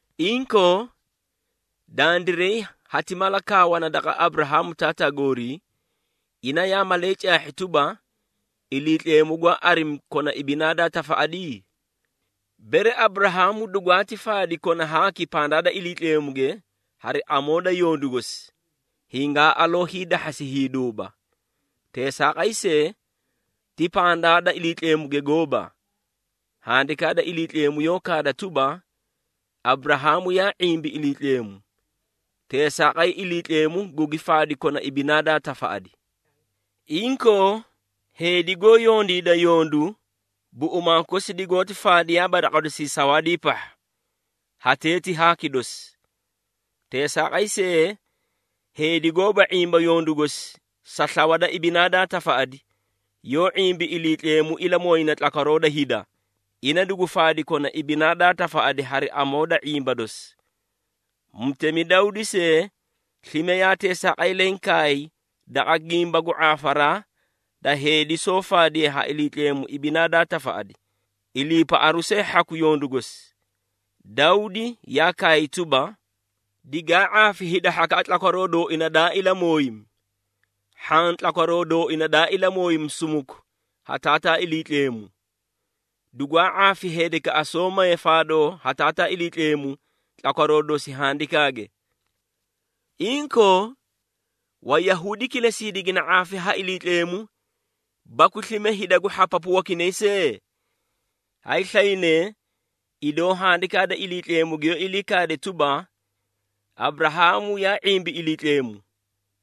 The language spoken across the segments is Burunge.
Inkoo, dandiray hati mala kaawana daqa Aburahaamu taataa goorii, ina yaa malee caahhi tuba, Iliitleemu gwaa arimi kona ibinaa daa tafaꞌadi? Bere Aburahaamu dugwaati faadi kona haaki pandaa da Iliitleemuge hari amoo da yondu gosi, hingaa aloo hiidahhasi hiiduuba. Teesaaqay see, ti pandaa da Iliitleemuge gooba. Handikaa da Iliitleemu yoó kaada tuba, “Aburahaamu yaa ⁄imbi Iliitleemu, teesaaqay Iliitleemu gugi faadi kona ibinaa daa tafaꞌadi.” Inkoo, heedi goó yondiida yondu, buꞌumaa kosi digoóti faadiyaaba daqa dosii sawaadii pahha, hatee ti haaki dosi. Teesaaqay see, heedi gooba ⁄imba yondu gosi sa slawa da ibinaa daa tafaꞌadi yoó ⁄imbi Iliitleemu ilamooyina tlakwaroo da hida, ina dugu faadi kona ibinaa daa tafaꞌadi hari amoo da ⁄imba dosi. Mutemi Dawdi see slime yaa teesaaqay leẽ kaay daqa gimba gu ⁄aafaraa da heedi soó faadiye ha Iliitleemu ibinaa daa tafaꞌadi, iliipaꞌaru see hhaku yondu gosi. Dawdi yaa kaay tuba, “Digaa ⁄aafi hida hhakaꞌa tlakwaroo dooina daa ilamooyimi, hhaã tlakwaroo dooina daa ilamooyimi sumuku ha Taataa Iliitleemu. Dugwaa ⁄aafi heedikaꞌa soó maye faadoo ha Taataa Iliitleemu tlakwaroo dosi handikaage.” Inkoo, Wayahuudi kilesii digina ⁄aafi ha Iliitleemu, baku slime hida gu hhapapu wakinay see? Hayslaynee idoo Handikaa da Iliitleemu giyoó ilii kaade tuba, “Aburahaamu yaa ⁄imbi Iliitleemu,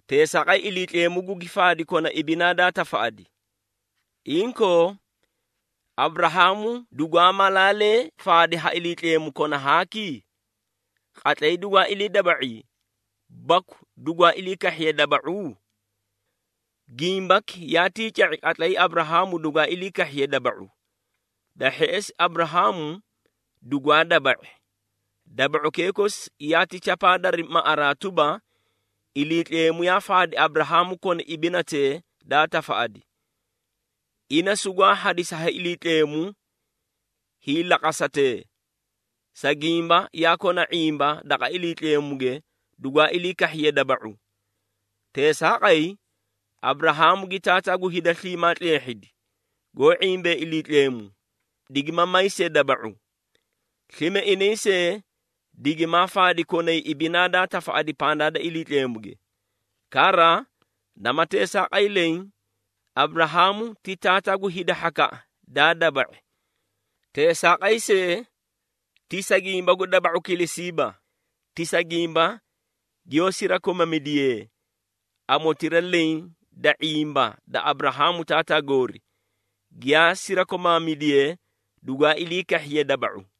teesaaqay Iliitleemu gugi faadi kona ibinaa daa tafaꞌadi.” Inkoo, Aburahaamu dugwaa malaalee faadi ha Iliitleemu kona haaki? Qatlay dugwaa ilii daba⁄i baku dugwaa ilii kahhiye daba⁄u? Gimbaki yaatii ca⁄i qatlay Aburahaamu dugwaa ilii kahhiye daba⁄u. Da hheꞌesi Aburahaamu dugwaa daba⁄i, daba⁄ukee kosi yaati chapaa dari maꞌaraa tuba, Iliitleemu yaa faadi Aburahaamu kona ibinatee daa tafaꞌadi. Ina sugwaa hadisi ha Iliitleemu hiilaqasatee, sa gimba yaa kona ⁄imba daqa Iliitleemuge dugwaa ilii kahhiye daba⁄u. Teesaaqay, Aburahaamu gi taataa gu hida sliimaa tleehhidi, goó ⁄imbee Iliitleemu, digima may see daba⁄u. Slime inay see digimaa faadi konay ibinaa daa tafaꞌadi pandaa da Iliitleemuge. Kara, nama teesaaqay leẽ, Aburahaamu ti taataa gu hida hhakaꞌa daa daba⁄i. Teesaaqay see, ti sa gimba gu daba⁄u kilesiiba. Ti sa gimba giyoó sirakomamidiyee amotira leẽ da ⁄imba da Aburahaamu taataa goori, giyaa sirakomaamidiyee dugwaa ilii kahhiye daba⁄u.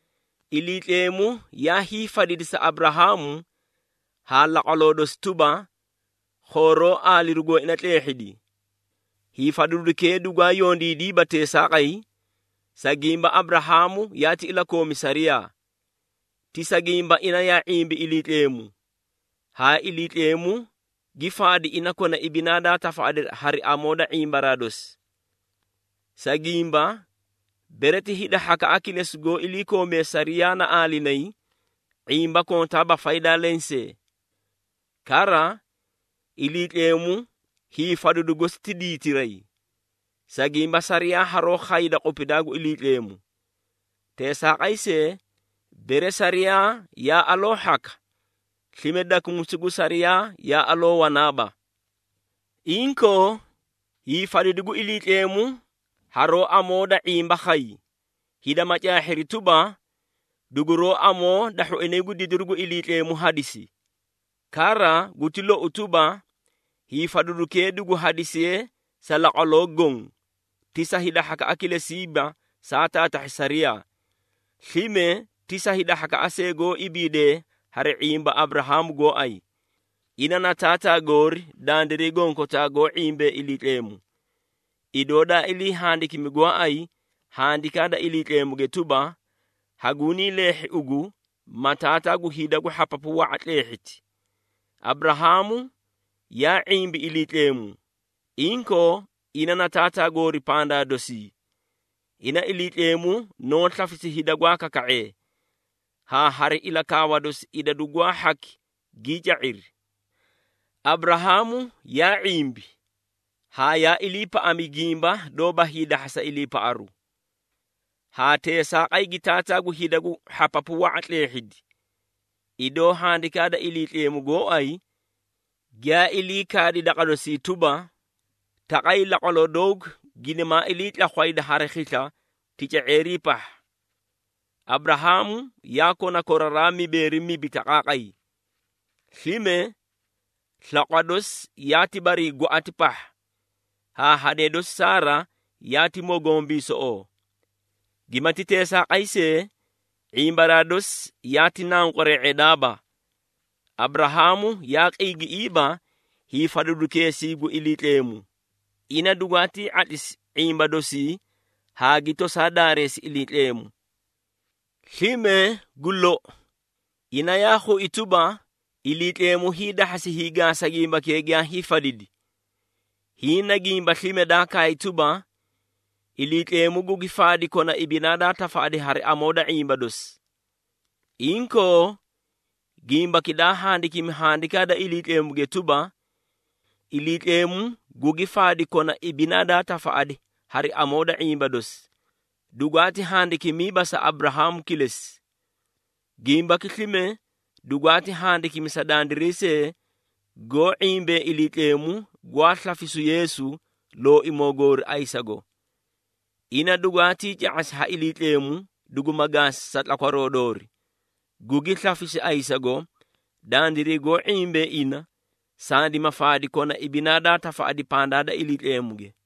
Iliitleemu yaa hiifadidi sa Aburahaamu haa laqwaloo dosi tuba, khooroo aaliru gooina tleehhidi. Hiifadidukee dugwaa yondiidiiba teesaaqay, sa gimba Aburahaamu yaati ilakoomi sariyaa. Ti sa gimba ina yaa ⁄imbi Iliitleemu, haa Iliitleemu gi faadi ina kona ibinaa daa tafaꞌadi hari amoo da ⁄imbaraa dosi. Sa gimba, bere ti hida hhakaꞌa kilesi goó ilakoomee sariyaa na aalinayi, ⁄imba kontaaba faydaa lensee. Kara, Iliitleemu hiifadidu gosi ti diitiray. Sa gimba sariyaa haroó khayda qupidaa gu Iliitleemu. Teesaaqay see, bere sariyaa yaa aloo hhaka, slime dakumisu gu sariyaa yaa aloo wanaaba. Inkoo, hiifadidu gu Iliitleemu haroó amoo da ⁄imba khay, hida ma caahhiri tuba, duguroó amoo da hhoinay gu didiru gu Iliitleemu hadisi. Kara guti lou tuba, hiifadidukee duguti hadisiye sa laqwaloo goõ. Ti sa hida hhakaꞌa kilesiiba saa taatahhi sariyaa, slime ti sa hida hhakaꞌa see goó ibiidee hari ⁄imba Aburahaamu gooay. Ina na taataa goori dandiray gonkotaa goó ⁄imbee Iliitleemu. Idoo daa ilii handikimi gooay Handikaa da Iliitleemuge tuba, “Hagunii leehhi ugu ma taataa gu hida gu hhapapu wa⁄a tleehhiti.” Aburahaamu yaa ⁄imbi Iliitleemu, inkoo ina na taataa goori pandaa dosii. Ina Iliitleemu noó slafisi hida gwaa kaka⁄ee, haa hari ilakaawa dosi idadu gwaa hhaki gii ca⁄iri. Aburahaamu yaa ⁄imbi haa yaa iliipaꞌami gimba doóba hiidahhasa iliipaꞌaru, haa teesaaqay gi taataa gu hida gu hhapapu wa⁄a tleehhidi, idoo Handikaa da Iliitleemu gooay giyaa ilii kaadi daqa dosii tuba, “Taqay, laqwaloo doogu ginimaa iliitlakhwayda hari khisla tica⁄eerii pahha.” Aburahaamu yaa kona koraraa mibeeri mibi taqaaqay. Slime, slaqwa dosi yaati barii gwaꞌati pahha, haa hadee dosi Saara yaati mogombiisoꞌoo. Giyaamati teesaaqay see, ⁄imbaraa dosi yaa naqware⁄edaaba. Aburahaamu yaa qiigiꞌiiba hiifadidukeesii gu Iliitleemu, ina dugwaatii ⁄atlisi ⁄imba dosii haa gi tosaa daareesi Iliitleemu. Slime gu lou, ina yaa khui tuba, Iliitleemu hiidahhasi hiigaasa gimbakee giyaa hiifadidi. Hiĩ na gimba slime daa kaay tuba, “Iliitleemu gugi faadi kona ibinaa daa tafaꞌadi hari amoo da ⁄imba dosi.” Inkoo, gimbaki daa handikimi Handikaa da Iliitleemuge tuba, “Iliitleemu gugi faadi kona ibinaa daa tafaꞌadi hari amoo da ⁄imba dosi,” dugwaati handikimiiba sa Aburahaamu kilesi. Gimbaki slime dugwaati handikimi sa dandiray see, goó ⁄imbee Iliitleemu gwaa slafisu Yeesu, Looimoo goori ayisago. Ina dugwaatii ca⁄asi ha Iliitleemu duguma gaasi sa tlakwaroo doori, gugi slafisi ayisago dandiray goó ⁄imbee ina, sandima faadi kona ibinaa daa tafaꞌadi pandaa da Iliitleemuge.